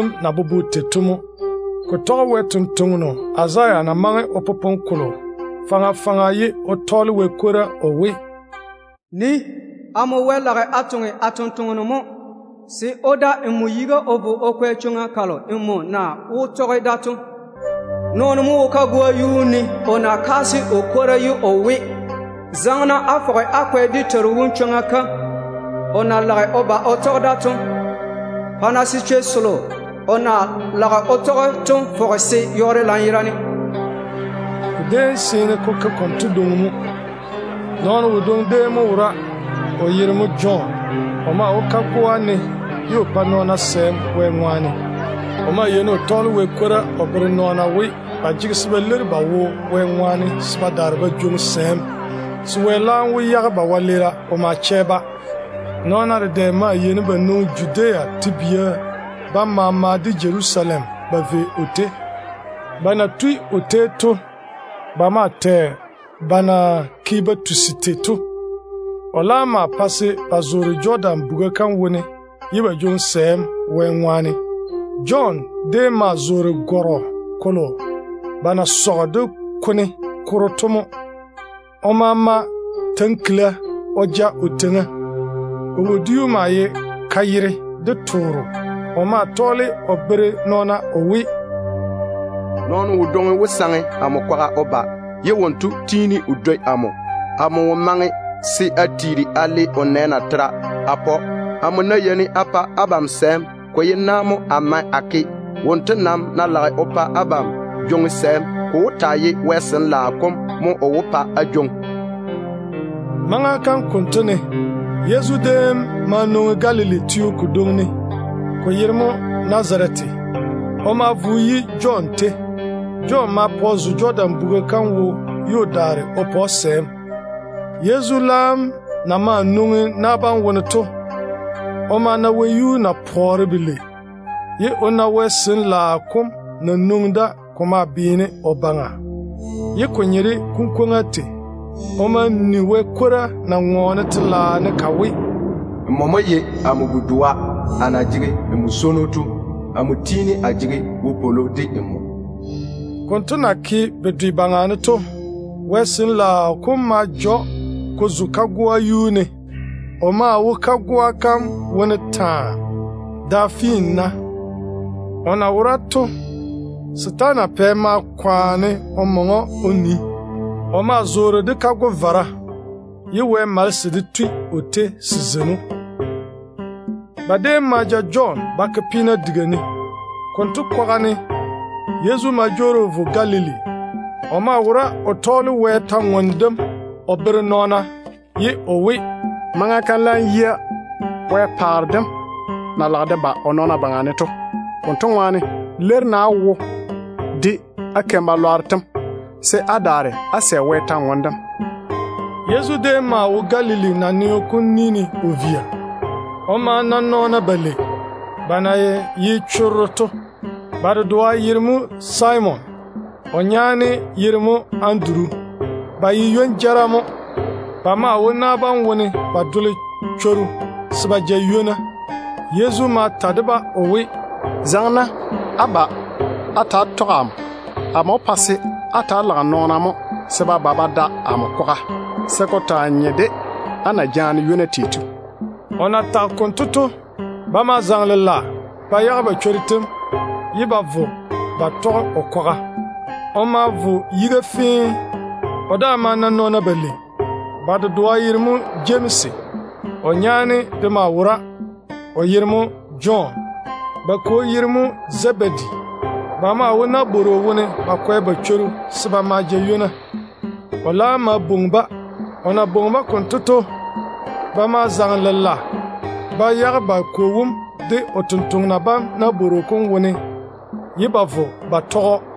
Ko na puli tei to tɔge Wɛ sampwora Izaya na maŋe o popone kolo faŋa faŋa ye o tɔɔle Wɛ kwora o we: “Nii, amo Wɛ lage a toŋe a tontoŋeno mo, se o da nmo yiga o vo o kwɛ chwoŋa kalo nmo na wó tɔge da to.” “Nɔɔno mo wo kagoa yuu ne o kaase o kwora ye o we, ‘Zaŋe-na á fɔge á kwɛ dé Teiru wom chwoŋa kam o na lage o ba o tɔge da to. Pa-na se chwei selo o na lage o tɔge to fɔge se yɔɔre lanyerane.’” Ko déem seene ko ke konto dwoŋi mo. Nɔɔno wodwoŋi déem mo wora, o yere mo Jɔn. O maa wo kagoa ne ye o pa nɔɔna sɛɛm Wɛ ŋwaane. O maa yeini o tɔɔle Wɛ kwora o bere nɔɔna we, ba jege se ba leiri ba wo Wɛ ŋwaane se ba daare ba jwoŋi sɛɛm, se Wɛ laam wó yage ba wɛleera o ma chɛ-ba. Nɔɔna dedɛ maa yeini ba nwoŋi Judea nawuura yam maama de Jerusalem ba vei o tei. Ba na tui o tei to, ba maa tɛ jaja ba na ke ba tusi tei to. O laam maa pae se ba zoore Jɔdan buga kam wone ye ba jwoŋi sɛɛm Wɛ ŋwaane. Jɔn déem maa zoore gɔrɔ kolo ba na sɔge de kone koro to mo. O maa mae tankila o ja o teiŋa. O wodiu mo ye kayere de tooro. O maa tɔɔle o bere nɔɔna o we, “Nɔɔno wodwoŋi wó saŋe amo kwaga o ba, ye wonto tiini o dwoi amo. Amo wo maŋe se a tiiri a le o nɛ natera a pa‑o. Amo ná yeini a pa abam sɛɛm, ko ye na mo a mae a ke. Wonto nam ná lage o pa abam jwoŋi sɛɛm, ko wó taa ye Wɛ Sin-laao kom mo o wó pa á jwoŋi.” Maŋa kam konto ne, Yezu déem ma zaŋe Galili teo kodwoŋi ne, ko yere mo Nazarete. O ma vo o yi Jɔn tei. Jɔn ma pa o zo Jɔdan buga kam wo ye o daare o pa‑o sɛɛm. Yezu na maa nwoŋi na bam wone to, o ma na wɛyuu na pɔɔre belei, ye o na Wɛ Sin-laao kom na nwoŋi da ko maa beene o baŋa, ko na nye de kunkwoŋa tei. O ma ni Wɛ kwora na ŋɔɔne telaao ne ka we: “Nmo mo ye amo bu-doa a na jege n swono to. N kikia su amo yi.” Konto na ke bedwe baŋa ne to, Wɛ Sin-laao kom ma ja‑o ko zo kagoa yuu ne. O maa wo kagoa kam wone taa, da finna. O na wora to, setaana pɛ maa kwaane o maŋe‑o o nii. O maa zoore de kago-vara, ye Wɛ malese de tui o tei se zeini‑o. Ba déem ma ja Jɔn ba ke peena diga ne. Konto kwaga ne, Yezu ma jwoori o vo Galili. O maa wora o tɔɔle Wɛ kwor-ywoŋa kam o bere nɔɔna, ye o we, “Maŋa kam laam yia Wɛ paare dem na lage de ba o nɔɔna baŋa ne to. Konto ŋwaane, leiri-na á wo de á wɛleera yam se á daare á sɛ Wɛ kwor-ywoŋa kam.” Yezu déem maa wo Galili naneo kom ni ne o via. O ma na nɔɔna balei, ba na ye chorro to. Ba dedoa yere mo Simon. O nyaane yere mo Anduru. Ba ye ywon-jara mo. Ba maa wo na bam wone ba dole chworu se ba ja ywona. Yezu ma ta de-ba o we, “Zaŋe-na á ba á ta‑á tɔge amo. Amo wó pa se á ta‑á lage nɔɔna mo se ba ba ba da amo kwaga, se ko taa nye de á zem na jaane ywona tei to.” O na tage konto to, ba ma zaŋe lela ba yage ba chworu tem ye ba vo ba tɔge o kwaga. O ma vo yiga fee. O daa ma na nɔɔna balei. Ba dedoa yere mo Jemsi. O nyaane de maa wora, o yere mo Jɔn. Ba kwo yere mo Zebedi. Ba maa wo nabworo wone ba kwɛ ba chworu se ba ma ja ywona. O laam ma yɔɔre o bwoŋi-ba. O na bwoŋi-ba konto to, ba ma zaŋe ba yage ba kwo wom de o tontoŋena bam nabworo kom wone ye ba vo ba tɔge‑o.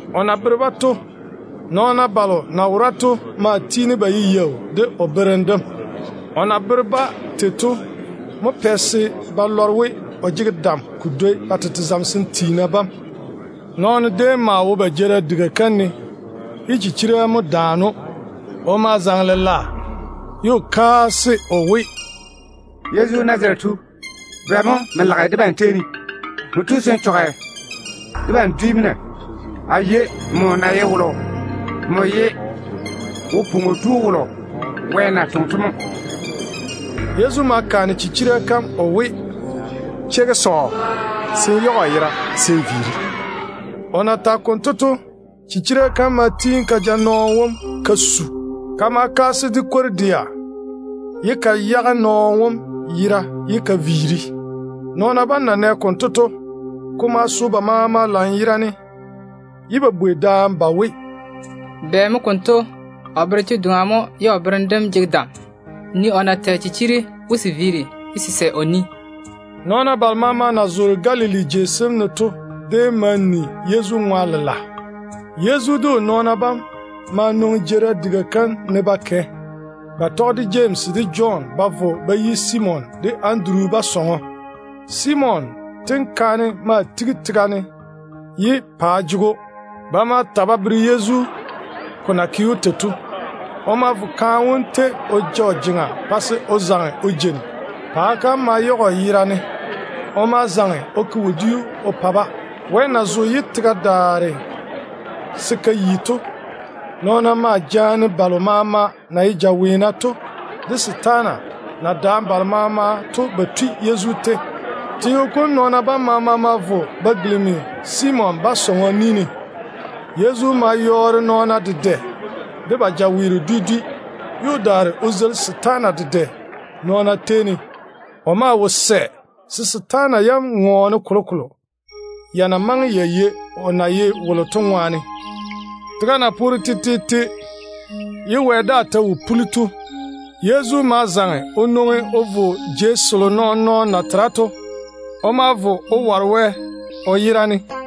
O na bere-ba tei to, nɔɔna balo na wora to maa tiini ba ye yaau de o berem dem. Ko pɛ se ba lɔre we, o jege dam ko dwoi ba tete zamesem tiina bam. Nɔɔno déem maa wo ba jeerim diga kam ne ye chichira daane‑o. O ma zaŋe lela ye o kaase o we, “Yezu, Nazarete tu, bɛ mo n lage debam tei ne? Nmo tu se n chɔge debam dwi mo na? A yei nmo na ye wolo. Nmo ye Wo-pwoŋo Tu wolo Wɛ na toŋe to mo.” Yezu ma bwɛ chichira kam o we, “Cheigi sɔɔ, se n yage o yera se n viiri.” O na tage konto to, chichira kam ma tiini ka ja nɔɔno wom ka su ye ka kaase de kwor-dɛa. Ka laam ma yage nɔɔno wom yera ka daare‑o. Nɔɔna bam na nɛ konto to, ko ma so ba maama lanyerane ye ba bwei daane ba we, “Bɛ mo konto? O bere che-doŋa mo ye o berem dem jege dam chekke. Nii o na tɛ chichiri we se viiri, ye se sɛ o ni.” Nɔɔna balo maama na zoore Galili jei sem ne to déem ma ni Yezu ŋwa lela. Yezu de o nɔɔna bam ma nwoŋi jeerim diga kam ne ba kɛ. Ba tɔge de Jemsi de Jɔn ba vo ba yi Simon de Anduru ba sɔŋɔ. Simon tenkaane maa tigi tega ne ye paa jege‑o. Ba ma ta ba bere Yezu ko na ke‑o tei to. O ma vo kaane wom tei o ja o jeŋa pa se o zaŋe o jeini. Paa kam ma yage‑o. O ma zaŋe o ke wodiu o pa-ba. Wɛ na zo ye tega daare se ka yi to, nɔɔna maa jaane balo maama na ye jaweena to de setaana na daane balo maama to ba tui Yezu tei. Teo kom nɔɔna bam maama ma vo ba tigisi Simon ba sɔŋɔ manchwoŋo ni ne. Yezu ma yɔɔre nɔɔna dedɛ de ba jaweero dwi dwi, ye o daare o zeili setaana dedɛ nɔɔna tei ne. O maa wo sɛ se setaana yam ŋɔɔne kolokolo, ya na maŋe ya yei o na ye wolo to ŋwaane. Tega na poore tetete ye wɛ daa ta wo puli to, Yezu ma zaŋe o nwoŋi o vo jei selo nɔɔn-nɔɔno na tera to. O ma vo o ware Wɛ o yera ne.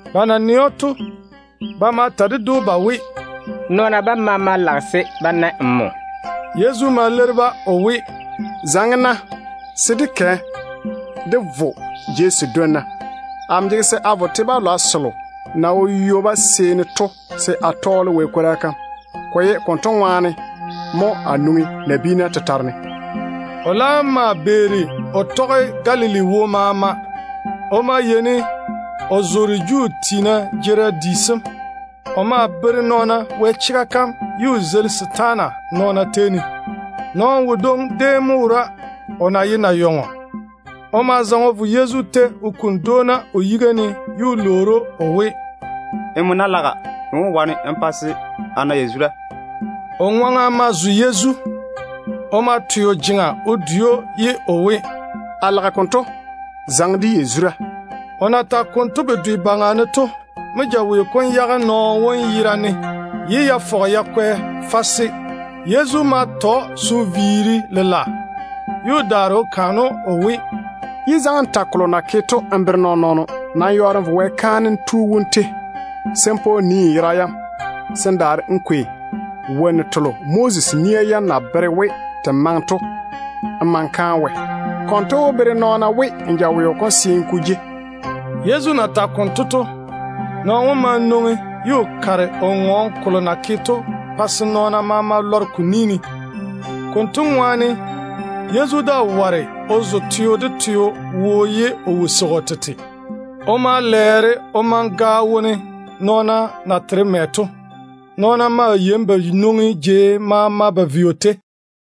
Ba na nɛ‑o to, ba ma ta ded‑o ba we, “Nɔɔna bam maama beeri nmo jei.” Yezu ma leiri-ba o we, “Zaŋe-na se dé kɛ dé vo jei sedwonna. Amo jege se a vo te-balwa balo na wo ywoba seeni to se a tɔɔle Wɛ kwora kam. Ko ye konto ŋwaane mo a nwoŋi se a taa toŋa.” O laam ma beeri o tɔge Galili wo maama. O maa yeini o zoore Juu tiina jeerim di sem. O maa bere nɔɔna Wɛ chega kam ye o zeili setaana nɔɔna tei ne. Nɔɔno wodwoŋi déem mo wora, o na ye nayɔŋɔ. O ma zaŋe o vo Yezu tei o kuni dwoona o yiga ne o lwoori‑o o we, “Nmo ná laga, n wó wane n pa se a na yazura.” O ŋwaŋa ma zo Yezu. Yezu de ma twe o jeŋa o dwei‑o, ye o we, “A lage konto. Zaŋe de yazura.” O na tage konto bedwe baŋa ne to mo jaweo kom yage nɔɔno wom ye o yera yam kwɛ fase. Yezu ma ta‑o se o viiri lela ye o daare o kaane‑o o we, “Yé zaŋe n ta kolo na ke to n bere nɔɔn-nɔɔno. Nam yɔɔre n vo Wɛ kaanem tu wom tei se n pa o nii n yera yam, se n daare n kwei wonnu telo Moses nia yam na bere we te maŋe to n ma n kaane Wɛ. Konto wó bere nɔɔna we n jaweo kom seene ko jei.” Yezu na tage konto to, nɔɔno wom ma nwoŋi o kare o ŋɔɔne kolo na ke to, pa se nɔɔna maama lɔre ko ni ne. Konto ŋwaane Yezu daa ware o zo teo de teo wo ye o wo seigi o tete. O ma lɛɛre o maŋe gaao wone nɔɔna na tera mɛ to. Nɔɔna maa yeini ba nwoŋa jei maama ba vei o tei.